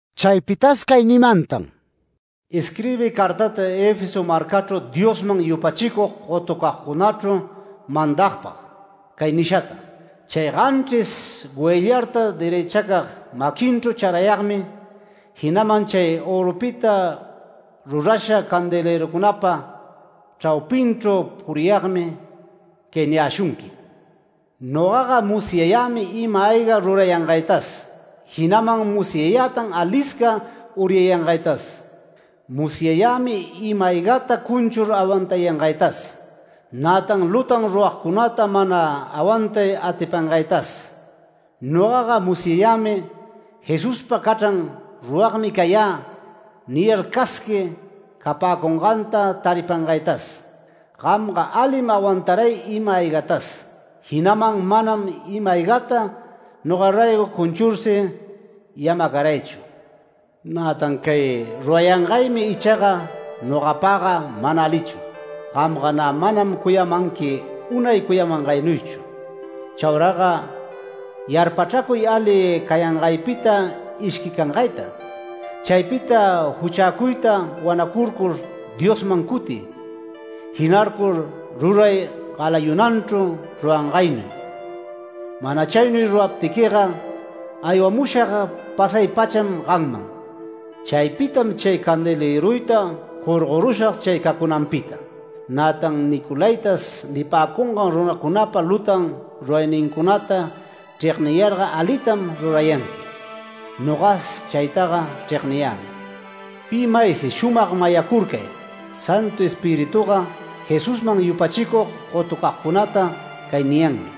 Chaypitas cay nimantan: “Isquirbiy cartata Efeso marcachru Diosman yupachicug gotucagcunachru mandagpag cay nishata: —‘Chay ganchris goyllarta derëchacag maquinchru charayagmi, jinaman chay örupita rurasha candelërucunapa chraupinchru puriyagmi cay niyäshunqui: Nogaga musyayämi ima-ayga rurayangaytas, jinaman musyätan alisca uryayangaytas. Musyayämi ima-aygata cunchur awantayangaytas, nätan lutan ruragcunata mana awantay atipangaytas. Nogaga musyayämi “Jesuspa cachran ruragmi cayä” niyar casqui capäcunganta taripangaytas. Gamga alim awantaray ima-aygatas, jinaman manam ima-aygata noga raygo cunchursi yamacaraychu. Nätan cay rurayangaymi ichaga nogapagga mana alichu. Gamga nä manam cuyamanqui unay cuyamangaynuychu. Chauraga yarpachracuy ali cayangaypita ishquicangayta. Chaypita juchäcuyta wanacurcur Diosman cutiy, jinarcur ruray galayunanchru rurangaynuy. Mana chaynuy ruraptiquiga aywamushag pasay-pacham gamman. Chaypitam chay candelëruyta jorgorushag chay cacunanpita. Nätan “Nicolaítas” nipäcungan runacunapa lutan ruraynincunata chregniyarga alitam rurayanqui. Nogas chaytaga chregniyämi. Pi maysi shumag mayacurcay, Santu Espirituga Jesusman yupachicug gotucagcunata cay niyanmi: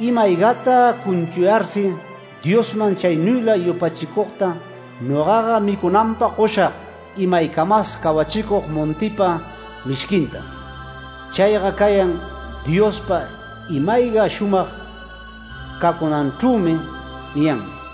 Ima-aygata cunchuyarsi Diosman chaynuyla yupachicugta, nogaga micunanpag goshag imaycamas cawachicug montipa mishquintam, chayga cayan Diospa ima-ayga shumag cacunanchrümi’ niyanmi”.—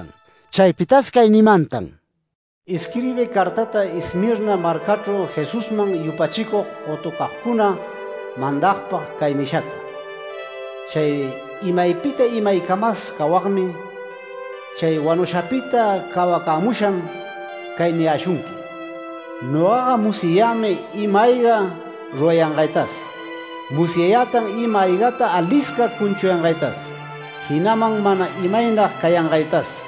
Chaypitas cay nimantan: “Isquirbiy cartata Esmirna marcachru Jesusman yupachicug gotucagcuna mandagpag cay nishata: —‘Chay imaypita imaycamas cawagmi, chay wanushapita cawacämusham. Cay niyäshunqui: Nogaga musyayämi ima-ayga rurayangaytas. Musyayätan ima-aygata alisca cuchuyangaytas, jinaman mana imaynag cayangaytas.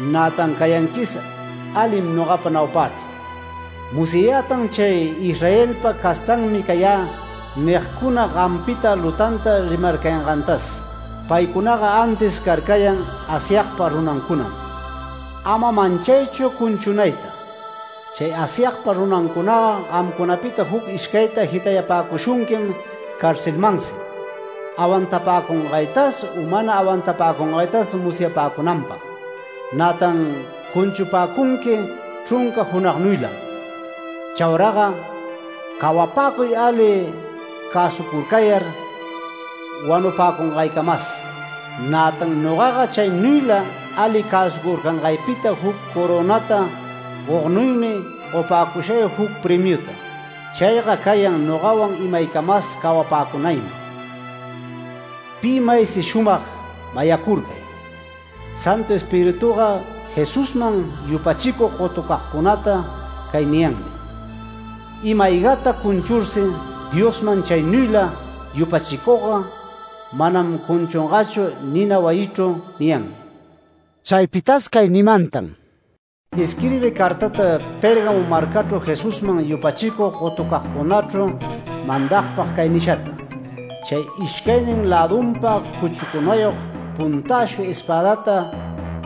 Nätan cayanquis alim nogapa naupächru. Musyayätan chay “Israelpa castanmi cayä” nigcuna, gampita lutanta rimarcayangantas. Paycunaga antis carcayan Asyagpa runancunam. Ama manchaychu cunchunayta. Chay Asyagpa runancunaga gamcunapita juc ishcayta jitayupäcushunquim carcelmansi, awantapäcungaytas u mana awantapäcungaytas musyapäcunanpag. Nätan cunchupäcunqui chrunca junagnuylam. Chauraga cawapäcuy ali cäsucurcayar wanupäcungaycamas. Nätan nogaga chaynuyla ali cäsucurcangaypita juc corönata gognuymi gopäcushay juc premiuta. Chayga cayan nogawan imacamas cawapäcunaymi. Pi maysi shumag mayacurcay, Santu Espirituga Jesusman yupachicug gotucagcunata cay niyanmi: Ima-aygata cunchursi Diosman chaynuyla yupachicugga manam cunchungachu nina wayichru’ niyanmi”.— Chaypitas cay nimantan: “Isquirbiy cartata Pérgamo marcachru Jesusman yupachicug gotucagcunachru mandagpag cay nishata: —‘Chay ishcaynin lädunpa cuchucunayog puntäshu espädata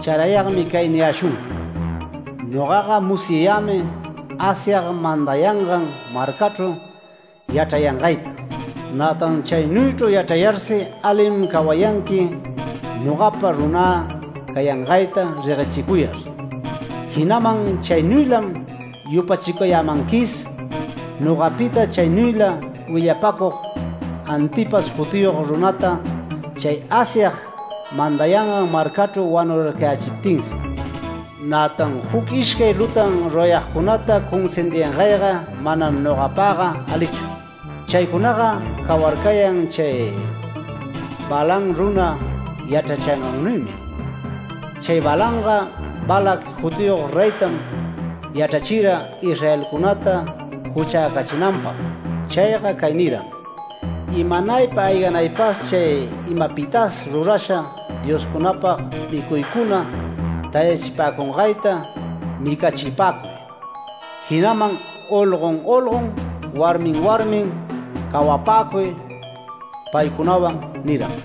charayagmi cay niyäshunqui: Nogaga musyayämi Asyag mandayangan marcachru yachrayangayta, nätan chaynuychru yachrayarsi alim cawayanqui nogapa runä cayangayta reguechicuyar. Jinaman chaynuylam yupachicayämanquis, nogapita chaynuyla willapacug Antipas jutiyog runäta chay Asyag mandayangan marcachru wanurarcayächiptinsi. Nätan juc ishcay lutan rurayagcunata cunsindiyangayga manam nogapagga alichu. Chaycunaga cawarcayan chay Balaam runa yachrachingannuymi. Chay Balaamga Balac jutiyog reytam yachrachira Israelcunata juchäcachinanpag. Chayga cay niram: “Imanaypa ayganaypas chay imapitas rurasha dioscunapag micuycuna tayachipäcungayta micachipäcuy, jinaman olgon olgon, warmin warmin cawapäcuy paycunawan” niram.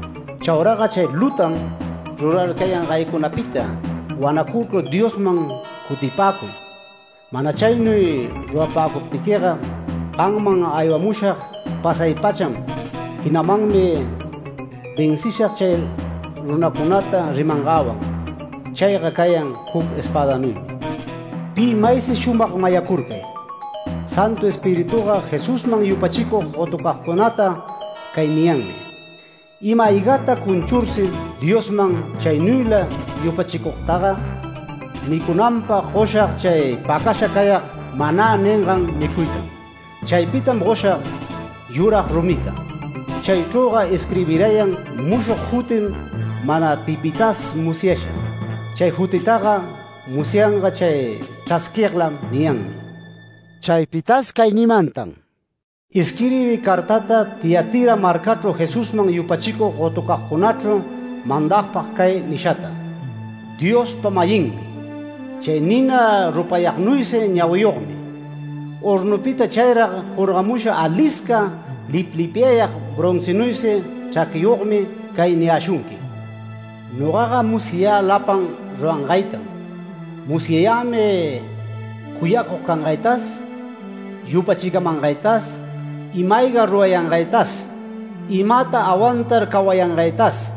Chauraga chay lutan rurarcayangaycunapita wanacurcur Diosman cutipäcuy. Mana chaynuy rurapäcuptiquiga, gamman aywamushag pasay-pacham. Jinamanmi vencishag chay runacunata rimangäwan, chayga cayan juc espädanuymi. ¡Pi maysi shumag mayacurcay! Santu Espirituga Jesusman yupachicug gotucagcunata cay niyanmi: Ima-aygata cunchursi Diosman chaynuyla yupachicugtaga micunanpag goshag chay pacasha cayag “manä” ningan micuytam. Chaypitam goshag yurag rumita. Chaychrüga isquirbirayan mushog jutim mana pipitas musyasha. Chay jutitaga musyanga chay chrasquiglam’ niyanmi”.— Chaypitas cay nimantan: “Isquirbiy cartata Tiatira marcachru Jesusman yupachicug gotucagcunachru mandagpag cay nishata: —‘Diospa-mayinmi, chay nina rupayagnuysi ñawiyogmi, hornupita chayrag jorgamusha alisca liplipyayag broncinuysi chraquiyogmi cay niyäshunqui: Nogaga musyayä lapan rurangaytam. Musyayämi cuyacug cangaytas, yupachicamangaytas, ima-ayga rurayangaytas, imata awantar cawayangaytas,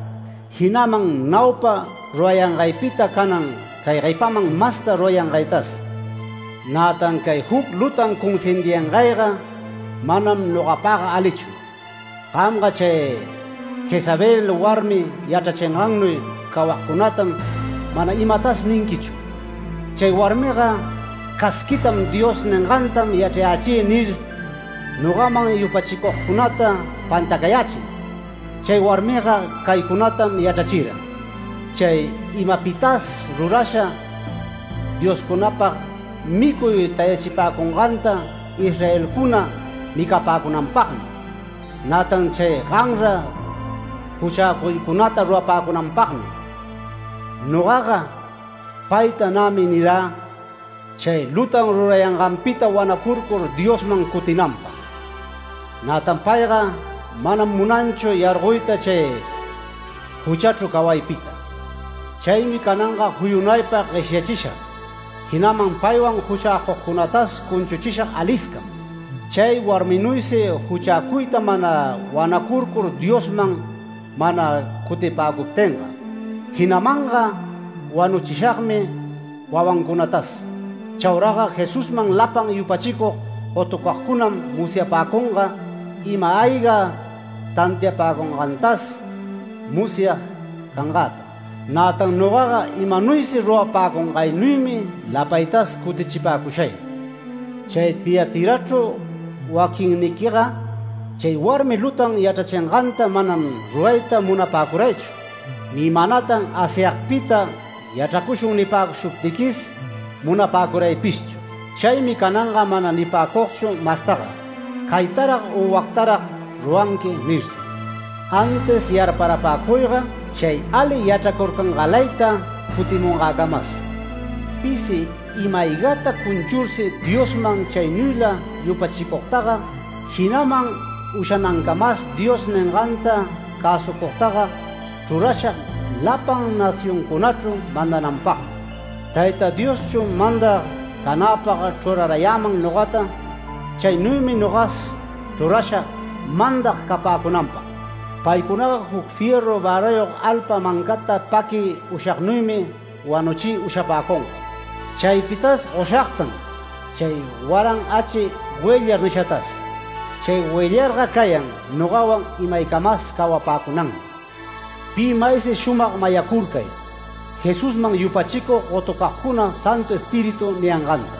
jinaman naupa rurayangaypita canan cay guepaman masta rurayangaytas. Nätan cay juc lutan cunsindiyangayga manam nogapagga alichu. Gamga chay Jezabel warmi yachrachingannuy cawagcunatam mana imatas ninquichu. Chay warmiga casquiytam “Dios ningantam yachrayächï” nir, nogaman yupachicugcunata pantacayächin. Chay warmiga caycunatam yachrachira: “Chay imapitas rurasha dioscunapag micuy tayachipäcunganta Israelcuna micapäcunanpagmi, nätan chay ganra juchäcuycunata rurapäcunanpagmi”. Nogaga payta nämi nirä chay lutan rurayanganpita wanacurcur Diosman cutinanpag. Nätan payga manam munanchu yargoyta chay juchachru cawaypita. Chaymi cananga juyunaypa gueshyachishag, jinaman paywan juchäcugcunatas cunchuchishag aliscam, chay warminuysi juchäcuyta mana wanacurcur Diosman mana cutipäcuptinga. Jinamanga wanuchishagmi wawancunatas. Chauraga Jesusman lapan yupachicug gotucagcunam musyapäcunga, ima-ayga tantiapäcungantas musyag cangäta. Nätan nogaga imanuysi rurapäcungaynuymi lapaytas cutichipäcushay. Chay Tiatirachru waquinniquiga chay warmi lutan yachrachinganta manam rurayta munapäcuraychu, ni manatan Asyagpita yachracushun nipäcushuptiquis munapäcuraypishchu. Chaymi “Canganga mana nipäcugchu mastaga caytaran u wactaran ruranqui” nirsi. Antis yarparapäcuyga chay ali yachracurcangalayta cutimungäcamas. Pisi ima-aygata cunchursi Diosman chaynuyla yupachicugtaga, jinaman ushanancamas Dios ninganta cäsucugtaga chrurashag lapan nacioncunachru mandanapagmi. Tayta Dioschu mandag canäpag chrurarayäman nogata, chaynuymi nogas chrurashag mandag capäcunanpag. Paycunaga juc fierru värayog alpa mancata paquiy ushagnuymi wanuchiy ushapäcunga. Chaypitas goshagtan chay waran achqui goyllar nishatas. Chay goyllarga cayan nogawan imaycamas cawapäcunanmi. Pi maysi shumag mayacurcay, Jesusman yupachicug gotucagcuna Santu Espíritu niyanganta’ ”.—